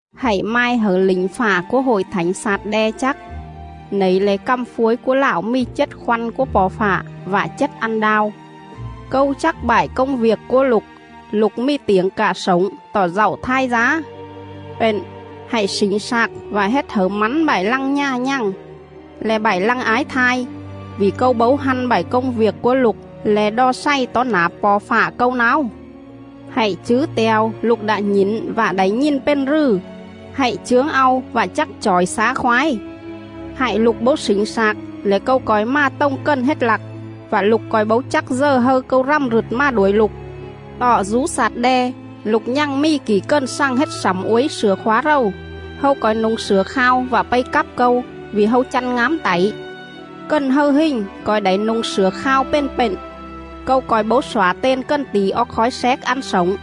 “Hạy mai hẩư lỉnh fạ cúa Hội Thảnh Xạt-đe chắc: Nẩy le̱ cằm phuối cúa Lạo mì chết khoăn cúa Po̱ Fạ, vạ chết ăn đao: ‘Câu chắc bại công viêc cúa lục; lục mì tiểng cạ slổng, tọ dạu thai dá. Pện, hạy slỉnh slạc vạ hết hẩư mắn bại lăng nhà nhằng, le̱ bại lăng ái thai, vỉ Câu bấu hăn bại công viêc cúa lục le̱ đo xày tó nả Po̱ Fạ Câu náo. Hạy chứ te̱o lục đạ nhỉn vạ đảy nhìn pền rừ; hạy chướng au vạ chắc chỏi xá khoái. Hại lục bấu slỉnh slạc lẻ Câu co̱i mà tồng cần hết lặc; vạ lục co̱i bấu chắc dờ hâư Câu rằm rựt mà đuổi lục.. Tọ dú Xạt-đe, lục nhằng mì kỉ cần xằng hết slẳm uối slửa khóa rầu; hâu co̱i nu̱ng slửa khao vạ pây cắp Câu, vỉ hâu chăn ngám tảy. Cần hâư hình co̱i đảy nu̱ng slửa khao pền pện; Câu co̱i bấu xỏa ten cần tỉ oóc khói xéc ăn slổng,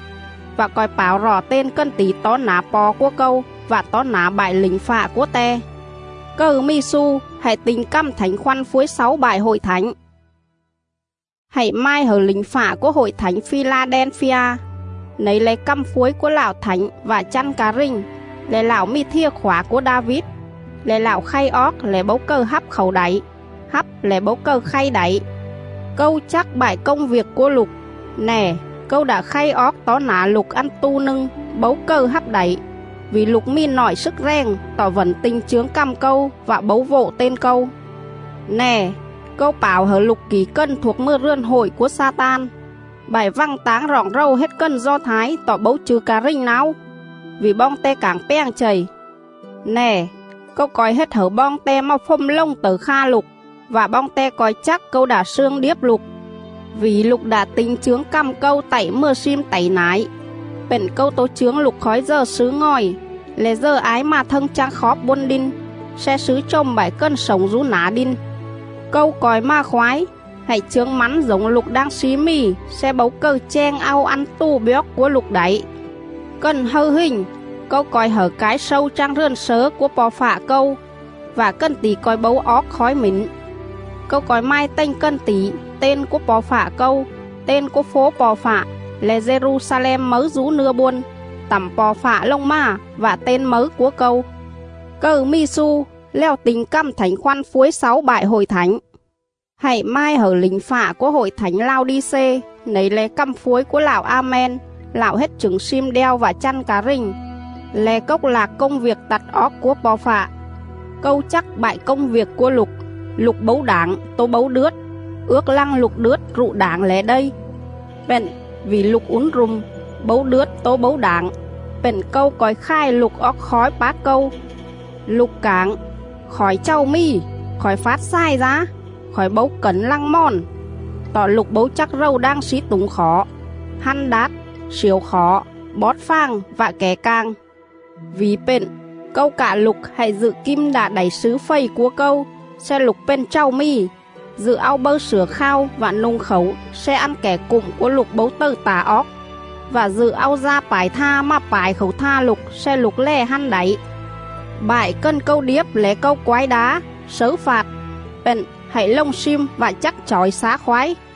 vạ co̱i páo rọ ten cần tỉ tó nả Po̱ cúa Câu vạ tó nả bại lỉnh fạ cúa Te.. Cầư mì xu, hạy ti̱nh cằm Thảnh Khoăn phuối xáu bại Hội Thảnh.’” “Hạy mai hẩư lỉnh fạ cúa Hội Thảnh Phi-la-đen-phi-a: Nẩy le̱ cằm phuối cúa Lạo Thảnh vạ chăn ca rình, le̱ Lạo mì thìa khỏa cúa Đa-vít, le̱ Lạo khay oóc lẻ bấu cầư hắp khảu đảy, hắp lẻ bấu cầư khay đảy:. ‘Câu chắc bại công viêc cúa lục. Nè, Câu đạ khay oóc tó nả lục ăn tu nâng bấu cầư hắp đảy, vỉ lục mì nọi slức rèng tọ vẩn ti̱nh chướng cằm Câu vạ bấu vộ ten Câu. Nè, Câu pảo hẩư lục kỉ cần thuộc mừa rườn hội cúa Xa-tan, bại vằng táng roọng rầu hết cần Do Thái tọ bấu chư̱ ca rình náo, vỉ boong te cảng pjàng chầy. Nè, Câu co̱i hết hẩư boong te mà fồm lồng tẩư kha lục, vạ boong te co̱i chắc Câu đạ slương điếp lục.. Vỉ lục đạ ti̱nh chướng cằm Câu tạy mừa slim tảy nải, pện Câu tố chướng lục khói dờ slứ ngòi, le̱ dờ ái mà thâng chang khóp bôn đin, sle slứ chồm bại cần slổng dú nả đin. Câu co̱i mà khoái; hạy chướng mắn dổng lục đang slí mì sle bấu cầư cheng au ăn tù bjoóc cúa lục đảy. Cần hâư hình, Câu co̱i hẩư cái slâu chang rườn slớ cúa Po̱ Fạ Câu; vạ cần tỉ co̱i bấu oóc khói mỉn. Câu co̱i mai tềnh cần tỉ: ten cúa Po̱ Fạ Câu, ten cúa fố Po̱ Fạ — le̱ Dê-ru-xa-lem mấư dú nưa bôn, tẳm Po̱ Fạ lồng mà — vạ ten mấư cúa Câu.. Cầư mì xu, lèo ti̱nh cằm Thảnh Khoăn phuối xáu bại Hội Thảnh.’” “Hạy mai hẩư lỉnh fạ cúa Hội Thảnh Lao-đi-xê: Nẩy le̱ cằm phuối cúa Lạo A-men, Lạo hết chửng slim đeo vạ chăn ca rình, le̱ cốc lạc công viêc tặt oóc cúa Po̱ Fạ:. ‘Câu chắc bại công viêc cúa lục; lục bấu đảng tố bấu đướt. Ước lăng lục đướt rụ đảng lẻ đây. Pện, vỉ lục ún ru̱m, bấu đướt tố bấu đảng, pện Câu co̱i khài lục oóc khói pác Câu.’ Lục cảng: ‘Khỏi chàu mì, khỏi fát xài dá, khỏi bấu cẩn lăng mòn.’ Tọ lục bấu chắc rầu đang slí tủng khỏ, hăn đát, sliểu khỏ, bót fàng vạ kẻ cảng. Vỉ pện, Câu cạ lục hạy dự kim đạ đảy slứ fầy cúa Câu sle lục pền chàu mì; dự au bâư slửa khao vạ nu̱ng khảu sle ăn kẻ cụm cúa lục bấu tầư tả oóc, vạ dự au da pải tha mà pải khảu tha lục sle lục lè hăn đảy. Bại cần Câu điếp lẻ Câu quái đá, slấư fạt; pện, hạy lồng slim vạ chắc chỏi xá khoái!.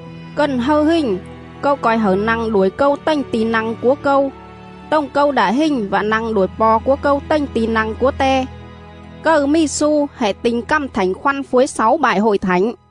Cần hâư hình, Câu co̱i hẩư nă̱ng đuổi Câu tềnh ti̱ nă̱ng cúa Câu, tồng Câu đạ hình vạ nă̱ng đuổi Po̱ cúa Câu tềnh ti̱ nă̱ng cúa Te. Cầư mì xu, hạy ti̱nh cằm Thảnh Khoăn phuối xáu bại Hội Thảnh.”